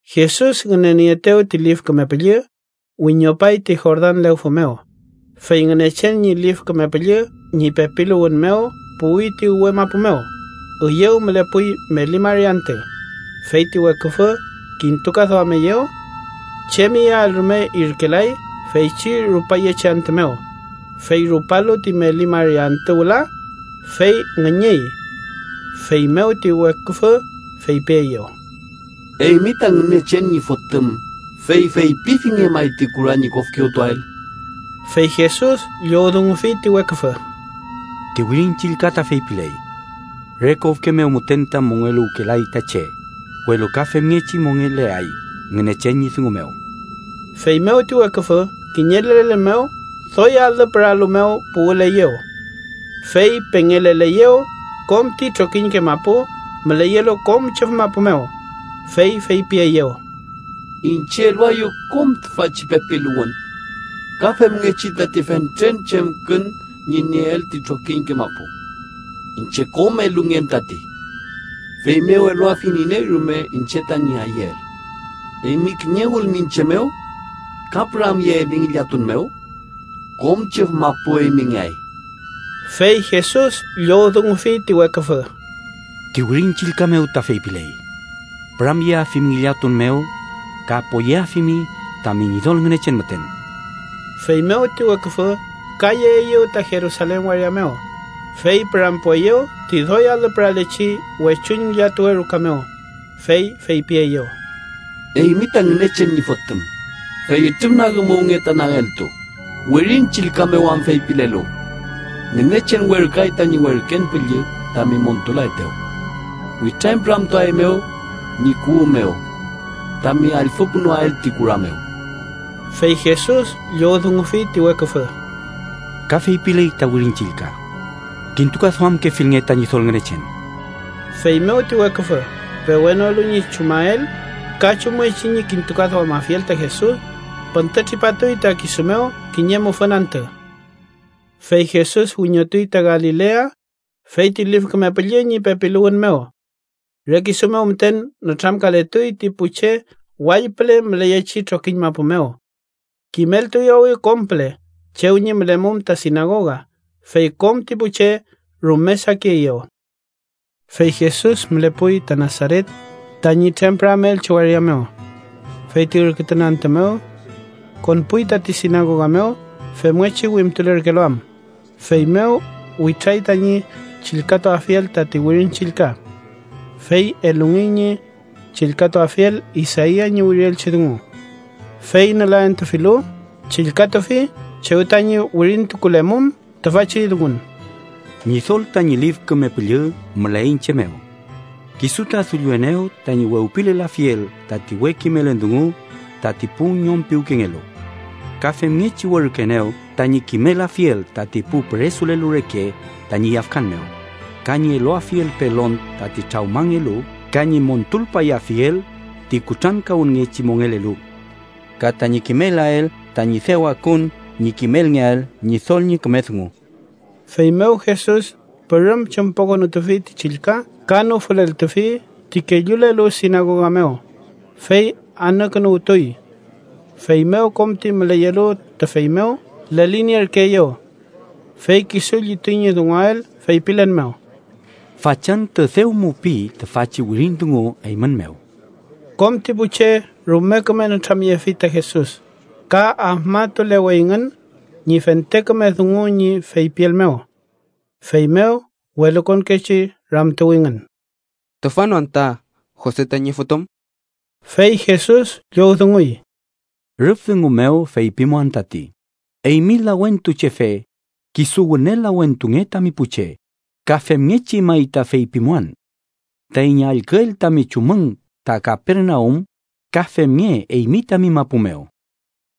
Jesus ngünenieetew ti Lif Küme Püllü, wiñopay ti Jordan lewfü mew, fey Ngünechen ñi Lif Küme Püllü ñi pepiluwün mew puwi ti uwe mapu mew. Üyew mülepuy meli mari antü, fey ti weküfü kintukaduameyew. Chem iyael rume irkelay feychi rupayechi antü mew, fey rupalu ti meli mari antü wüla, fey ngüñüy. Feymew ti weküfü feypieyew: —Eymi ta Ngünechen ñi Fotüm, fey feypifinge may ti kura ñi kofkewtuael. Fey Jesus llowdungufi ti weküfü: —Ti Wirin Chillka ta feypiley: ‘Re kofke mew müten ta mongeluwkelay ta che, welu ka femngechi mongeleay Ngünechen ñi dungu mew.’ Feymew ti weküfü kiñe lelen mew doy alü püralu mew puwüleyew. Fey pengeleleyew kom ti trokiñke mapu müleyelu kom chüf mapu mew, fey feypieyew: —Iñche eluaeyu kom tüfachi pepiluwün ka femngechi tati fentren chemkün ñi nieel ti trokiñke mapu. Iñche kom elungen tati, feymew eluafiñ iney rume iñche tañi ayüel. Eymi kiñewülmi iñche mew ka püramyeeli ngillatun mew, kom chüf mapu eymingeay. Fey Jesus llowdungufi ti weküfü: —Ti Wirin Chillka mew ta feypiley: ‘Püramyeafimi ngillatun mew ka poyeafimi tami Ñidol Ngünechen müten.’ Feymew ti weküfü ka yeeyew ta Jerusalen waria mew, fey pürampueyew ti doy alü püralechi wechuñ ngillatuwe ruka mew, fey fepieyew: —Eymi ta Ngünechen ñi Fotüm, fey ütrüfnagümuwnge ta nageltu, Wirin Chillka mew am feypilelu: ‘Ngünechen werküay tañi werken püllü tami montulaetew. Witrañpüramtuaeymew ñi kuwü mew tami allfüpunoael ti kura mew.’ Fey Jesus llowdungufi ti weküfü: —Ka feypiley ta Wirin Chillka: ‘Kintukaduamkefilnge ta Ñidol Ngünechen.’ Feymew ti weküfü, pewenolu ñi chumael ka chumngechi ñi kintukaduamafiel ta Jesus, püntütripatuy ta kisu mew kiñe mufün antü. Fey Jesus wiñotuy ta Galilea fey ti Lif Küme Püllü ñi pepiluwün mew. Re kisu mew müten nütramkaletuy ti pu che wall püle müleyechi trokiñ mapu mew. Kimeltuyawi kom püle chew ñi mülemum ta sinagoga, fey kom ti pu che rume sakieyew. Fey Jesus mülepuy ta Nasaret, tañi trempüramelchi waria mew. Fey ti ürkütun antü mew konpuy tati sinagoga mew femngechi wimtulerkelu am, feymew witray tañi chillkatuafiel tati Wirin Chillka. Fey elungey ñi chillkatuafiel Isaia ñi wirielchi dungu. Fey nülaentufilu, chillkatufi chew tañi wirintukulemum tüfachi dungun: “Ñidol tañi Lif Küme Püllü müley iñche mew. Kisu ta dullienew tañi wewpilelafiel tati we kimelün dungu tati pu ñom piwkengelu. Ka femngechi werküenew tañi kimelafiel tati pu püresulelu reke tañi yafkan mew ka ñi eluafiel pelon tati trawmangelu ka ñi montulpayafiel ti kutrankawünngechi mongelelu. Ka tañi kimelael tañi dew akun ñi kimelngeael Ñidol ñi küme dungu.” Feymew Jesus pürüm chümpokünutufi ti chillka ka nüfüleltufi ti kellulelu sinagoga mew, fey anükünuwtuy. Feymew kom ti müleyelu tüfey mew lelinierkeeyew. Fey kisu llituy ñi dunguael feypilen mew: —Fachantü dew mupiy tüfachi wirin dungu eymün mew. Kom ti pu che rume küme nütramyefi ta Jesus ka afmatuleweyngün ñi fente küme dungu ñi feypiel mew. Feymew welukonkechi ramtuwingün: —¿Tüfa no anta Jose tañi fotüm? Fey Jesus llowdunguy: —Rüf dungu mew feypimuan tati: ‘Eymi lawentuchefe, kisu wüne lawentunge tami pu che.’ Ka femngechi may ta feypimuan: ‘Taiñ allküel tami chumün ta Kapernaum ka femnge eymi tami mapu mew.’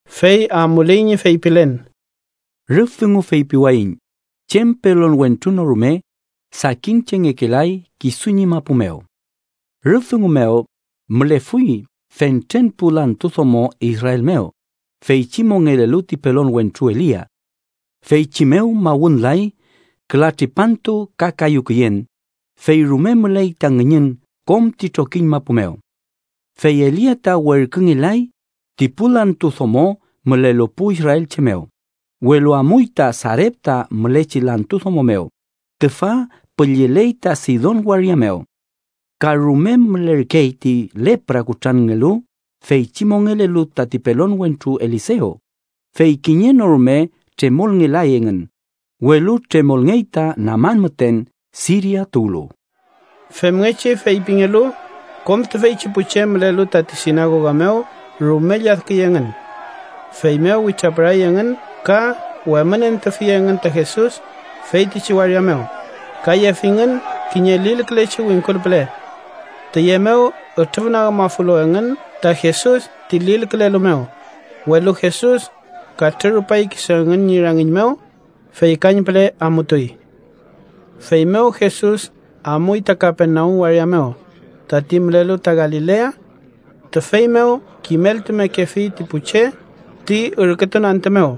Fey amuley ñi feypilen: —Rüf dungu feypiwayiñ chem pelon wentru no rume, sakin chengekelay kisu ñi mapu mew. Rüf dungu mew mülefuy fentren pu lantu domo Israel mew, feychi mongelelu ti pelon wentru Elia. Feychi mew mawünlay küla tripantu ka kayu küyen, fey rume müley ta ngüñün kom ti trokiñ mapu mew. Fey Elia ta werküngelay ti pu lantu domo mülelu pu israelche mew, welu amuy ta Sarepta mülechi lantu domo mew, tüfa pülleley ta Sidon waria mew. Ka rume mülerkey ti lepra kutranngelu feychi mongelelu tati pelon wentru Elisew, fey kiñe no rume tremolngelay engün, welu tremolngey ta Naman müten, Siria tuwlu. Femngechi feypingelu, kom tüfeychi pu che mülelu tati sinagoga mew rume lladküy engün. Feymew witrapüray engün ka wemünentufi engün ta Jesus feytichi waria mew, ka yefingün kiñe lilkülechi wingkul püle. Tüye mew ütrüfnagümafulu engün ta Jesus ti lilkülelu mew, welu Jesus katrürupay kisu engün ñi rangiñ mew, fey kañpüle amutuy. Feymew Jesus amuy ta Kapernaum waria mew, tati mülelu ta Galilea. Tüfey mew kimeltumekefi ti pu che ti ürkütun antü mew.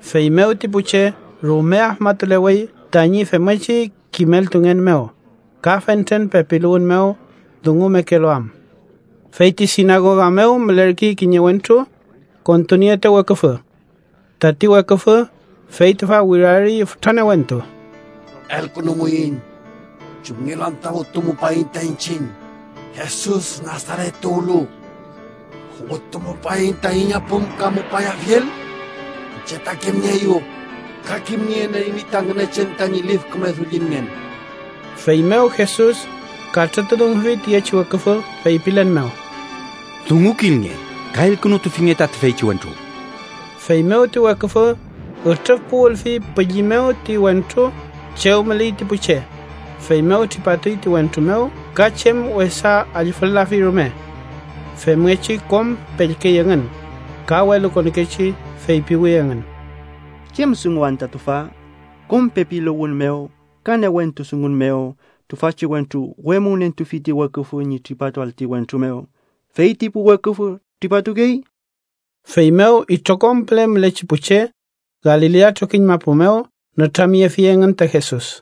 Feymew ti pu che rume afmatulewey tañi femngechi kimeltungen mew, ka fentren pepiluwün mew dungumekelu am. Fey ti sinagoga mew mülerkey kiñe wentru kontunieetew weküfü. Tati weküfü, fey tüfa wirarüy fütra newentu: —¡Elkünumuiñ! ¿Chumngelu anta wütumupaiñ ta iñchiñ, Jesus Nasaret tuwlu? ¿Wütumupaiñ taiñ apümkamupayafiel? Iñche ta kimnieeyu, ka kimnien eymi ta Ngünechen tañi lif küme Dullinngen. Feymew Jesus katrütudungufi tiyechi weküfü feypilen mew: —¡Dungukilnge ka elkünutufinge ta tüfeychi wentru! Feymew ti weküfü ütrüfpuwülfi pülli mew ti wentru chew müley ti pu che, feymew tripatuy ti wentru mew ka chem wesa allfül-lafi rume. Femngechi kom pellkey engün, ka welukonkechi feypiwi engün: “¿Chem dungun anta tüfa? Kom pepiluwün mew ka newentu dungun mew tüfachi wentru wemünentufi ti weküfü ñi tripatuael ti wentru mew, ¡fey ti pu weküfü tripatukey!” Feymew itrokom püle mülechi pu che Galilea trokiñ mapu mew nütramyefi engün ta Jesus.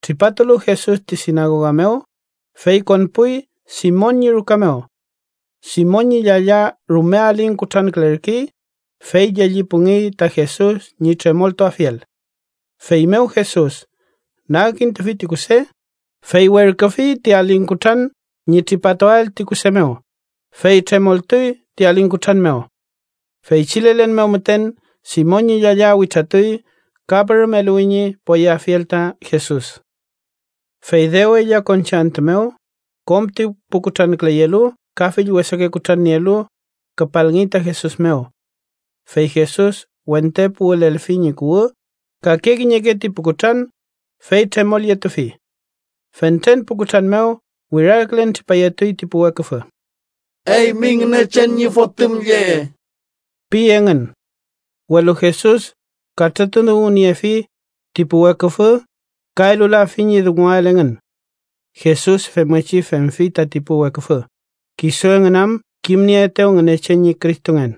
Tripatulu Jesus ti sinagoga mew, fey konpuy Simon ñi ruka mew. Simon ñi llalla rume aling kutrankülerkey, fey llellipungey ta Jesus ñi tremoltuafiel. Feymew Jesus nagkintufi ti kuse, fey werküfi ti aling kutran ñi tripatuael ti kuse mew, fey tremoltuy ti aling kutran mew. Feychi lelen mew müten Simon ñi llalla witratuy ka pürüm eluwi ñi poyeafiel ta Jesus. Fey dew ella konchi antü mew, kom ti pu kutranküleyelu ka fill wesake kutran nielu, küpalngey ta Jesus mew. Fey Jesus wente puwülelfi ñi kuwü kake kiñeke ti pu kutran, fey tremolyetufi. Fentren pu kutran mew wirarkülen tripayetuy ti pu weküfü: “¡Eymi Ngünechen ñi Fotüm lle!” pi engün. Welu Jesus katrütudunguniefi ti pu weküfü ka elulafi ñi dunguael engün. Jesus femngechi femfi tati pu weküfü, kisu engün am kimnieetew Ngünechen ñi Cristongen.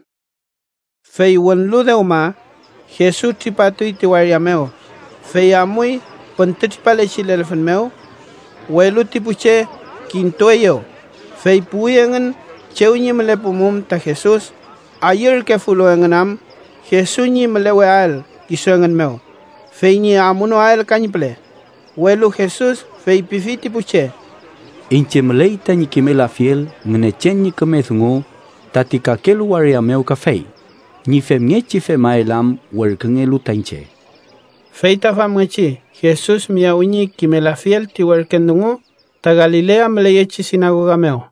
Fey wünlu dewma, Jesus tripatuy ti waria mew, fey amuy püntütripalechi lelfün mew. Welu ti pu che kintueyew, fey puwi engün chew ñi mülepumum ta Jesus, ayürkefulu engün am Jesus ñi müleweael kisu engün mew, fey ñi amunoael kañpüle. Welu Jesus feypifi ti pu che: —Iñche müley tañi kimelafiel Ngünechen ñi küme dungu tati kakelu waria mew kafey, ñi femngechi femael am werküngelu ta iñche. Feyta famngechi Jesus miyawi ñi kimelafiel ti werken dungu ta Galilea müleyechi sinagoga mew.